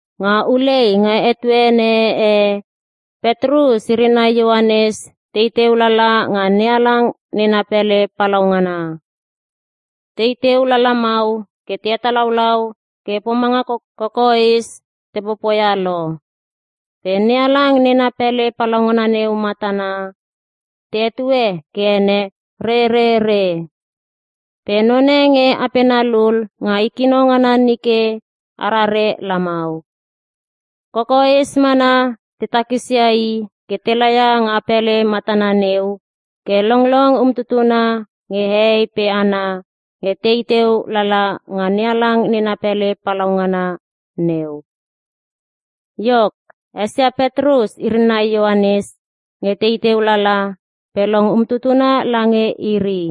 Nga ulei nga etuene e, Petrus iri nai Ioanes tei teu lala nga NeHalang nena pele palaungana. Tei teu lalamau ke te hetalaulau ke pomanga kokoes te popoia lo. Pe NeHalang nena pele palaungana neu matana, te hetue ke ene Rerere. Pe none nge apena lul nga i kino ngana nike arare lamau. Kokoes mana te takisia i ke te laia nga pele matana neu, ke longlong umtutuna nge hehei pe hana nge tei teu lala nga NeHalang nena pele palaungana neu. Iok, esia Petrus iri nai Ioanes nge tei teu lala, pe long umtutuna lange iri.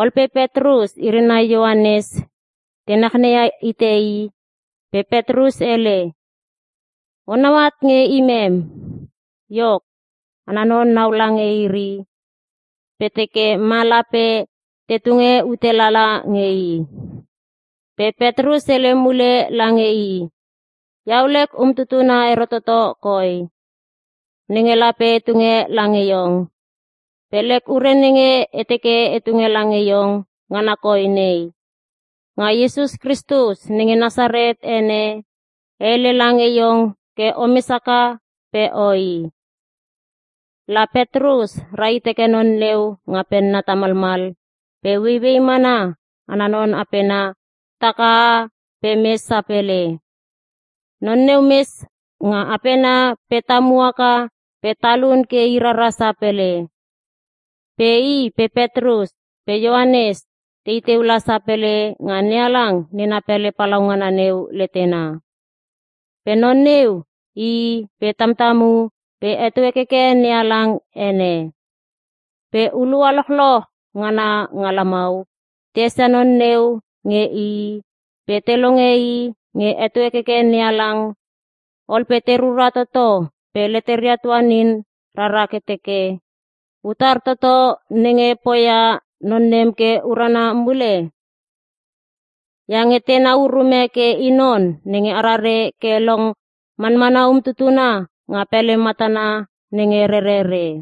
Ol pe Petrus iri nai Ioanes te nachnei hite i, pe Petrus hele, “Onau at nge imem!” Iok, ana non naula nge iri nai pe teke ma lape te tunge ute lala nge i. Pe Petrus hele mule lange i, “Iau lek umtutuna ero toto koi, nenge lape e tunge lange iong. Pe lek ure nenge e teke e tunge lange iong ngana koi nei; Nga Iesus Kristus nenge Nasaret ene, e hele lange iong ke omes haka pe oi!” La Petrus rahit heke non neu nga penna tamalmal pe ueiuei mana ana non apena takaha pe mes sapele. Non neu mes nga apena pe tamu haka pe talun ke i rara sapele. Pe i pe Petrus pe Ioanes tei teu la sapele nga NeHalang nena pele palaungana neu letena. Pe non neu ii pe tamtamu pe heto hekeke NeHalang ene. Pe hulua lochloch ngana nga lamau te esia non neu nge ii pe te longe i nge heto hekeke NeHalang, ol pe te rura toto pe leteria tuanin rara ke te teke, “Utar toto nenge poia non nem ke urana mule?” Iange tenau urume ke i non nenge arare ke long manmana umtutuna nga pele matana nenge Rerere.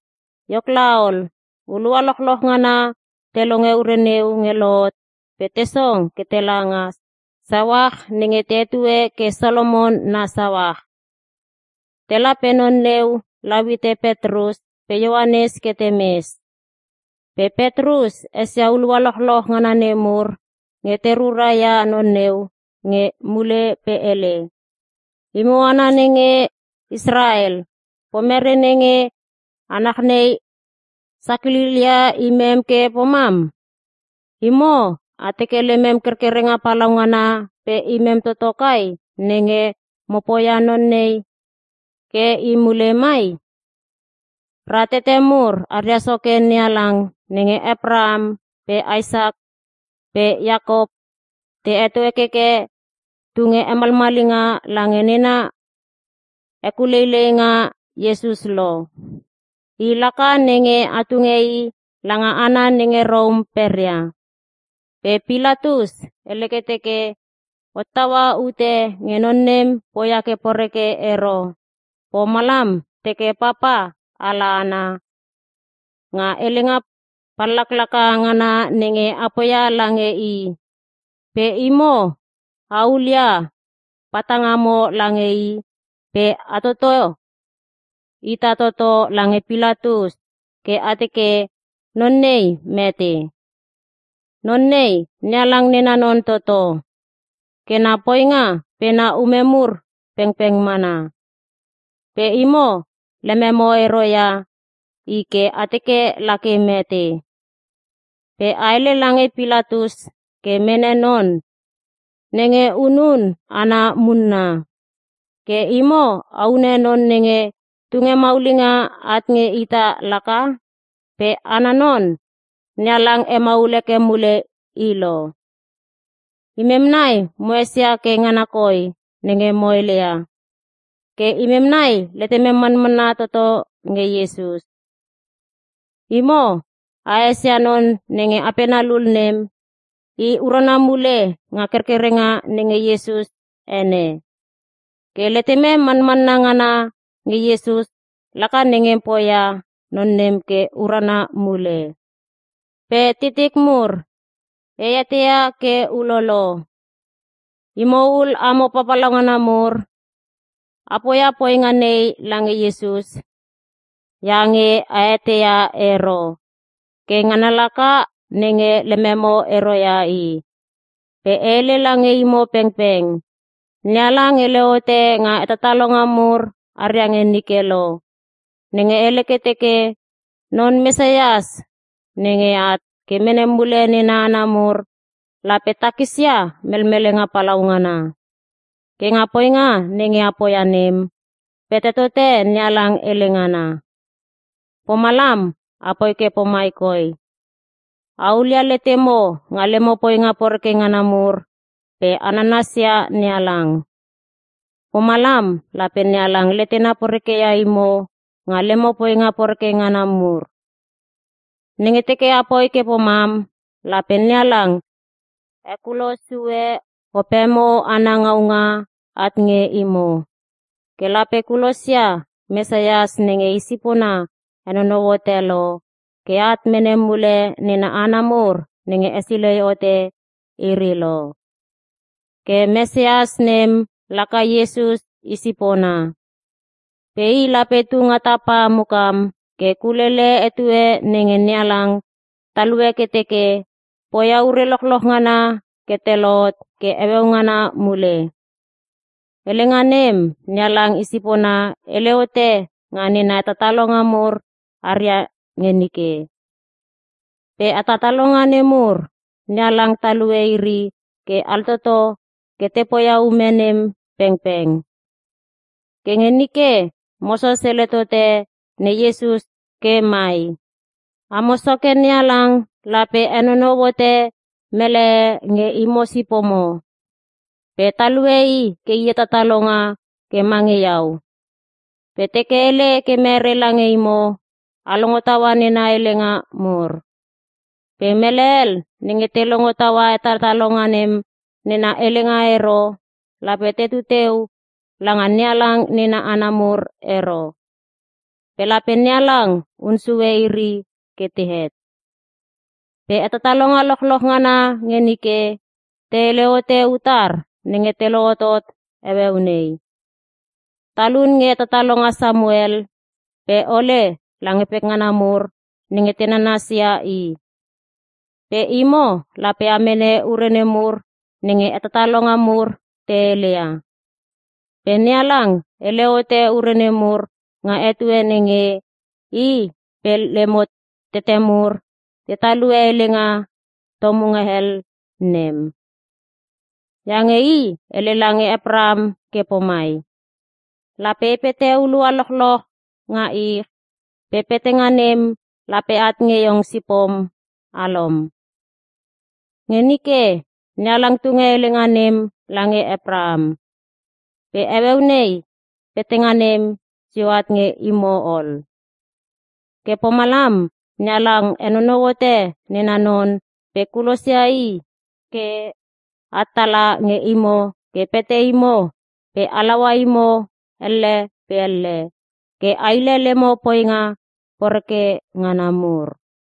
Iok laol, hulua lochloch ngana te longe ure neu nge lohot pe te song ke tela nga sauach nenge te hetue ke Solomon na Sauach. Tela pe non neu lau hite Petrus pe Ioanes ke temes. Pe Petrus esia hulua lochloch ngana nemur nge te rura ia non neu nge i mule pe hele, “Imo hana nenge Israel, pomere nenge a nachnei sakililia imem ke pomam? Imo a teke lemem kerkerenga palaungana pe imem toto kai, nenge mo poia non nei ke i mule mai? Ra tete mur aria soke NeHalang nenge Apraham pe Isak pe Iakop te heto hekeke, tunge hemalmalinga lange nena hekuleileinga, Iesus lo. I laka nenge a tunge i langa hana nenge Rom peria. Pe Pilatus hele ke teke hottaua ute nge non nem poia ke poreke ero, pomalam teke papa ala ana nga helenga pallaklaka ngana nenge a poia lange i. Pe imo a hulia patangamo lange i pe a toto ita toto lange Pilatus ke a teke, non nei mete. Non nei, NeHalang nena non toto. Ke na poinga pe na ume mur pengpeng mana. Pe imo lememo ero ia i ke a teke lake mete. Pe a hele lange Pilatus ke mene non nenge hunun hana munna. Ke imo a hune non nenge tunge maulinga at nge ita laka. Pe ana non, NeHalang hemaul heke mule i lo. Imem nai mo esia ke ngana koi nenge mo heleia. Ke imem nai letemem manmanna toto nge Iesus. Imo a esia non nenge apena lul nem, i urana mule nga kerkerenga nenga Iesus ene. Ke letemem manmanna ngana nge Iesus laka nenge poia non nem ke urana mule. “Pe titik mur, e eteia ke ulolo. Imo ul amo papalauna mur, a poia poinga nei lange Iesus iange a eteia ero. Ke ngana laka nenge lememo ero ia i. Pe e hele lange imo pengpeng, NeHalang hele hote nga hetatalonga mur haria nge nike lo. Nenge hele ke teke, ‘Non Mesias nenge at ke mene mule nena hana mur, lape takisia melmelenga palaungana.’ Ke nga poinga nenge a poia nem, pete tote NeHalang hele ngana. Pomalam apoi ke pomai koi; A hulia letemo nga lemo poinga poreke ngana mur pe a nanasia NeHalang. Pomalam lape NeHalang letena porekeia imo nga lemo poinga poreke ngana mur. Nenge teke apoi ke pomam, lape NeHalang hekulo sue opemo ana ngaunga at nge imo. Ke lape kulosia Mesias nenge i sipona henonou hote lo, ke at mene mule nena hana mur nenge hesilei hote iri lo. Ke Mesias nem laka Iesus i sipona. Pe i lape tunga tapa mukam ke kulele etue nenge NeHalang talue ke teke, poia ure lochloch ngana ke te lohot ke heueu ngana mule. Helenga nem, NeHalang i sipona hele hote nga nena hetatalonga mur haria nge nike. Pe hetatalonga nemur, NeHalang talue iri ke altoto ke te poia ume nem pengpeng. Ke nge nike, Moses hele tote Ne Iesus ke mai, “‘Amo Soke NeHalang lape henonou hote mele e nge imo sipomo, pe talue i ke i hetatalonga ke mange iau. Pe teke hele ke mere lange imo, a longo taua nena helenga mur. Pe mele hel nenge te longo taua hetatalonga nem nena helenga ero, lape tetu teu langa NeHalang nena hana mur ero. Pe lape NeHalang hun sue iri ke tehet.’ “Pe hetatalonga lochloch ngana nge nike, te hele hote utar nenge te lohotot heueu nei. Talun nge hetatalonga Samuel pe ole lange pekngana nemur nenge te nanasia i. Pe imo lape a mene ure nemur nenge hetatalonga mur te heleia. Pe NeHalang hele hote ure nemur nga etue nenge, i pe lemo tete mur te talue helenga tomunga hel nem. Iange i hele lange Apraham ke pomai, ‘Lape e pete hulua lochloch nga ich, pe petanga nem lape at nge iong sipom alom.’ Nge nike, NeHalang tunge helenga nem lange Apraham, pe heueu nei, petanga nem sio at nge imo ol. Ke pomalam NeHalang henonou hote nena non pe kulosia i ke at tala nge imo ke pete imo pe halaua imo elle pe elle, ke a hile lemo poinga poreke ngana mur.”